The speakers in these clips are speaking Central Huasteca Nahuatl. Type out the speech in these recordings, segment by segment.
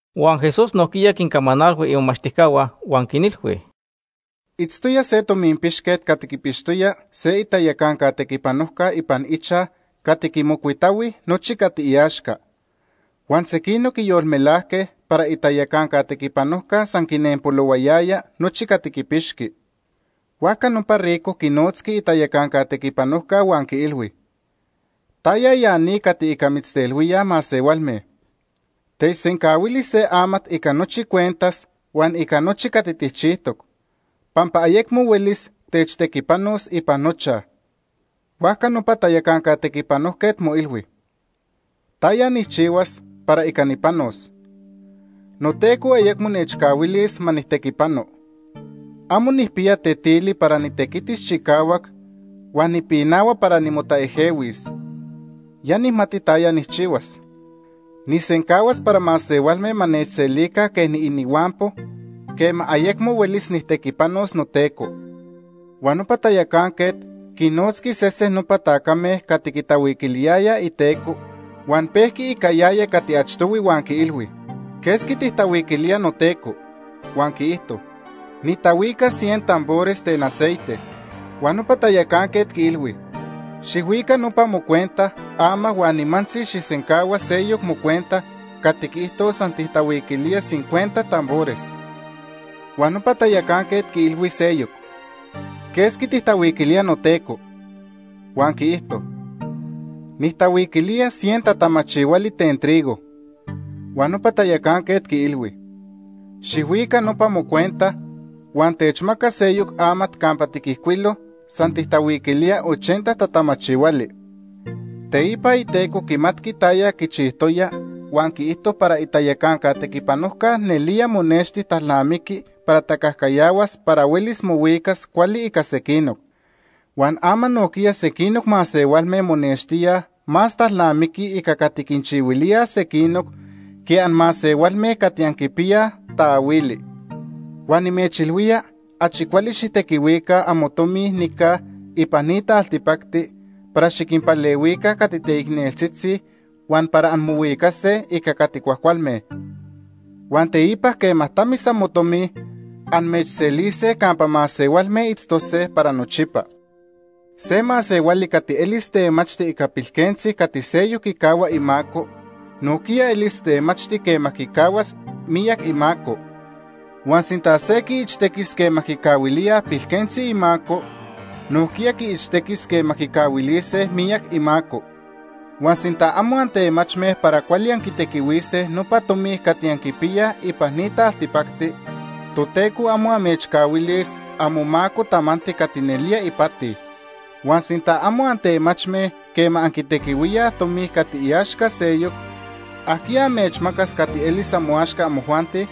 Huan Jesús nojquiya quincamanalhui imomachtijcahua huan quinilhui: “Itztoya se tominpixquet cati quipixtoya se itayacanca tequipanojca ipan ichaj cati quimocuitahui nochi cati iaxca. Huan sequinoc quiyolmelajque para itayacanca tequipanojca san quinempolohuayaya nochi cati quipixqui. Huajca nopa rico quinotzqui itayacanca tequipanojca huan quiilhui: ‘¿Taya ya ni cati ica mitztelhuíaj masehualme? Techsencahuili se amat ica nochi cuentas huan ica nochi cati tijchijtoc, pampa ayecmo huelis techtequipanos ipan nochaj.’ “Huajca nopa tayacanca tequipanojquet moilhui: ‘¿Taya nijchihuas para ica nipanos? Noteco ayecmo nechcahuilis ma nijtequipano. Amo nijpiya tetili para nitequitis chicahuac, huan nipinahua para nimotaejehuis. Ya nijmati taya nijchihuas. Nijsencahuas para masehualme ma nechselica quej niinihuampo quema ayecmo huelis nijtequipanos noteco.’ “Huan nopa tayacanquet quinnotzqui sesen nopa tacame cati quitahuiquiliyayaj iteco, huan pejqui ica yaya cati achtohui, huan quiilhui: ‘¿Quesqui tijtahuiquilía noteco?’ Huan quiijto: ‘Nitahuica cien tambores ten aceite.’ Huan nopa tayacanquet quiilhui: ‘Xijhuica nopa mocuenta ama huan nimantzi xijsencahua seyoc mocuenta cati quiijtos san tijtahuiquilía cincuenta tambores.’ Huan nopa tayacanquet quiilhui seyoc: ‘¿Quesqui tijtahuiquilía noteco?’ Huan quiijto: ‘Nijtahuiquilía cien tatamachihuali ten trigo.’ Huan nopa tayacanquet quiilhui: ‘Xijhuica nopa mocuenta huan techmaca seyoc amat campa tiquijcuilo san tijtahuiquilía ochenta tatamachihuali.’ Teipa iteco quimatqui taya quichijtoya huan quiijto para itayacanca tequipanojca nelía monexti talnamiqui para tacajcayahuas para huelis mohuicas cuali ica sequinoc. Huan ama nojquiya sequinoc masehualme monextíaj más talnamiquij ica cati quinchihuilíaj sequinoc que anmasehualme cati anquipiyaj taahuili. “Huan nimechilhuía achi cuali xijtequihuica amotomi nica ipan ni taltipacti para xiquinpalehuica cati teicneltzitzi huan para anmohuicase ica cati cuajcualme. Huan teipa quema tamis amotomi, amechselise campa masehualme itztose para nochipa. “Se masehuali cati elis temachti ica pilquentzi cati seyoc quicahua imaco, nojquiya elis temachti quema quicahuas miyac imaco. Huan sinta se quiichtequis quema quicahuilíaj pilquentzi imaco, nojquiya quiichtequis quema quicahuilise miyac imaco. Huan sinta amo antemachme para cuali anquitequihuise nopa tomi cati anquipiyaj ipan ni taltipacti, Toteco amo amechcahuilis amomaco tamanti cati nelía ipati. Huan sinta amo antemachme quema anquitequihuíaj tomi cati iaxca seyoc, ¿ajquiya amechmacas cati elis amoaxca amojuanti?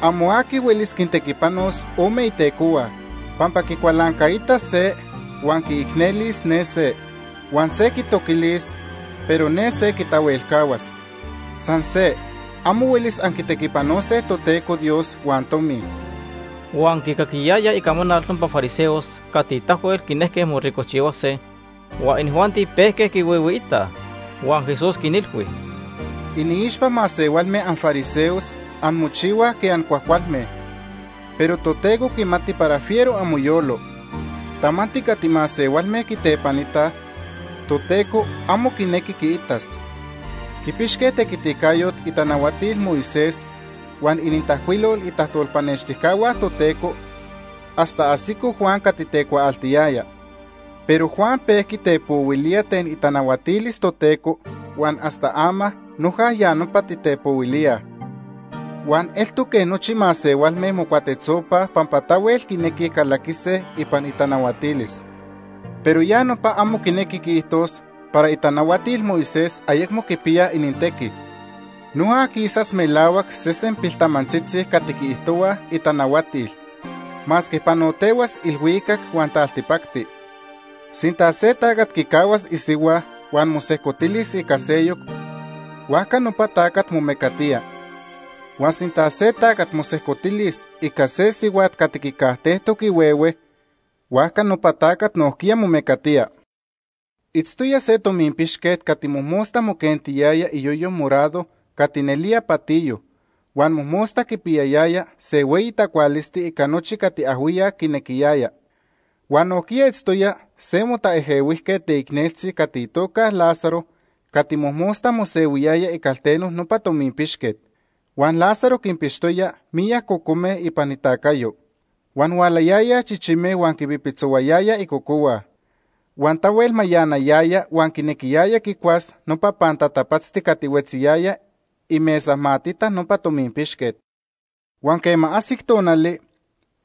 “Amo aqui huelis quintequipanos ome itecohua pampa quicualancaitas se huan quiicnelis ne se. Huan se quitoquilis, pero ne se quitahuelcahuas. San se, amo huelis anquitequipanose Toteco Dios huan tomi.” Huan quicaquiyayaj icamanal nopa fariseos cati tahuel quinejque moricojchihuase, huan inijuanti pejque quihuihuiitaj. Huan Jesús quinilhui: “Iniixpa masehualme anfariseos anmochihuaj quej ancuajcualme, pero Toteco quimati para fiero amoyolo. Tamanti cati masehualme quitepanitaj, Toteco amo quinequi quiitas. “Quipixque tequiticayot itanahuatil Moisés huan inintajcuilol itajtolpanextijcahua Toteco hasta ajsico Juan cati tecuaaltiyaya. Pero Juan pejqui tepohuilía ten itanahuatilis Toteco huan hasta ama noja ya nopa titepohuilíaj. Huan eltoc quej nochi masehualme mocuatetzopaj pampa tahuel quinequij calaquise ipan itanahuatilis. “Pero ya nopa amo quinequi quiijtos para itanahuatil Moisés ayecmo quipiyaj inintequi. Noja quisas melahuac sesen piltamantzitzi cati quiijtohua itanahuatil, masque panotehuas ilhuicac huan taltipacti. “Sinta se tacat quicahuas isihua huan mosejcotilis ica seyoc, huajca nopa tacat momecatía. Huan sinta se tacat mosejcotilis ica se sihuat cati quicajtejtoc ihuehue, huajca nopa tacat nojquiya momecatía. “Itztoya se tominpixquet cati mojmosta moquentiyaya iyoyo morado cati nelía patiyo, huan mojmosta quipiyayaya se hueyi tacualisti ica nochi cati ajhuiyac quinequiyaya. Huan nojquiya itztoya se motaejehuijquet teicneltzi cati itoca Lázaro cati mojmosta mosehuiyaya icalteno nopa tominpixquet. Huan Lázaro quinpixtoya miyac cocome ipan itacayo. Huan hualayayaj chichime huan quipipitzohuayayaj icocohua. Huan tahuel mayanayaya huan quinequiyaya quicuas nopa pantatapatzti cati huetziyaya imesamatita nopa tominpixquet. Huan quema ajsic tonali,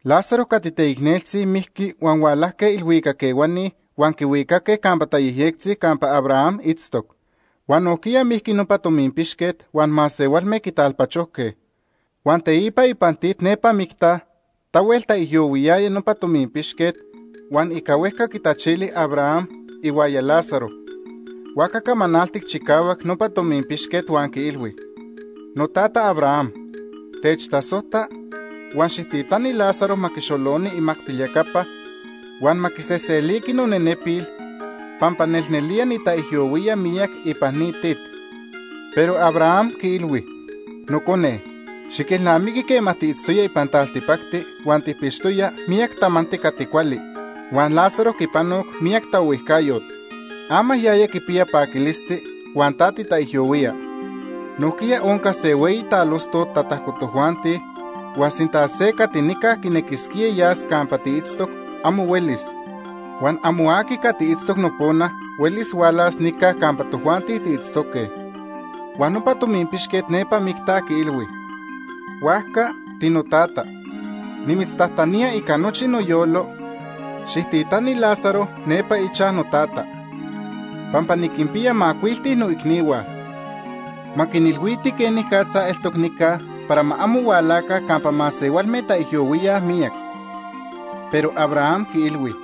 Lázaro cati teicneltzi mijqui huan hualajque ilhuicac ehuani huan quihuicaque campa tayejyectzi campa Abraham itztoc. Huan nojquiya mijqui nopa tominpixquet huan masehualme quitalpachojque. Huan teipa ipan tit nepa micta, tahuel taijyohuiyaya nopa tominpixquet, huan ica huejca quitachili Abraham ihuaya Lázaro. Huajca camanaltic chicahuac nopa tominpixquet huan quiilhui: ‘Notata Abraham, techtasojta, huan xijtitani Lázaro ma quixoloni imacpilyacapa, huan ma quiseseliqui nonenepil pampa nelnelía nitaijyohuía miyac ipan ni tit.’ Pero Abraham quiilhui: ‘Nocone, xiquelnamiqui quema tiitztoya ipan taltipacti huan tijpixtoya miyac tamanti cati cuali, huan Lázaro quipanoc miyac taohuijcayot. Ama yaya quipiya paquilisti, huan ta titaijyohuía. Nojquiya onca se hueyi talostot tatajco tojuanti huan sinta se cati nica quinequisquía yas campa tiitztoc, amo huelis. Huan amo aqui cati itztoc nopona huelis hualas nica campa tojuanti tiitztoque.’ “Huan nopa tominpixquet nepa micta quiilhui: ‘Huajca, tinotata, nimitztajtanía ica nochi noyolo, xijtitani Lázaro nepa ichaj notata. Pampa niquinpiya macuilti noicnihua. Ma quinilhuiti quenicatza eltoc nica para ma amo hualaca campa masehualme taijyohuíaj miyac.’ Pero Abraham quiilhui: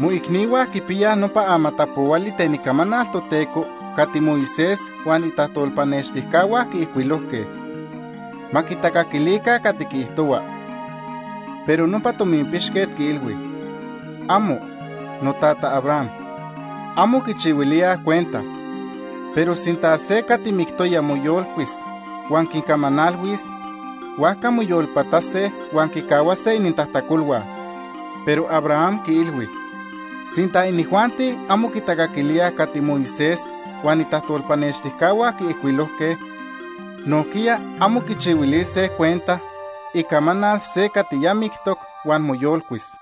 ‘Moicnihua quipiyaj nopa amatapohuali ten Icamanal Toteco cati Moisés huan itajtolpanextijcahua quiijcuilojque. Ma quitacaquilica cati quiijtohua.’ Pero nopa tominpixquet quiilhui: ‘¡Amo! Notata Abraham, amo quichihuilíaj cuenta. Pero sinta se cati mictoya moyolcuis huan quincamanalhuis, huajca moyolpatase huan quicahuase inintajtacolhua.’ Pero Abraham quiilhui: ‘Sinta inijuanti amo quitacaquilíaj cati Moisés huan itajtolpanextijcahua quiijcuilojque, nojquiya amo quichihuilise cuenta icamanal se cati ya mictoc huan moyolcuis.’”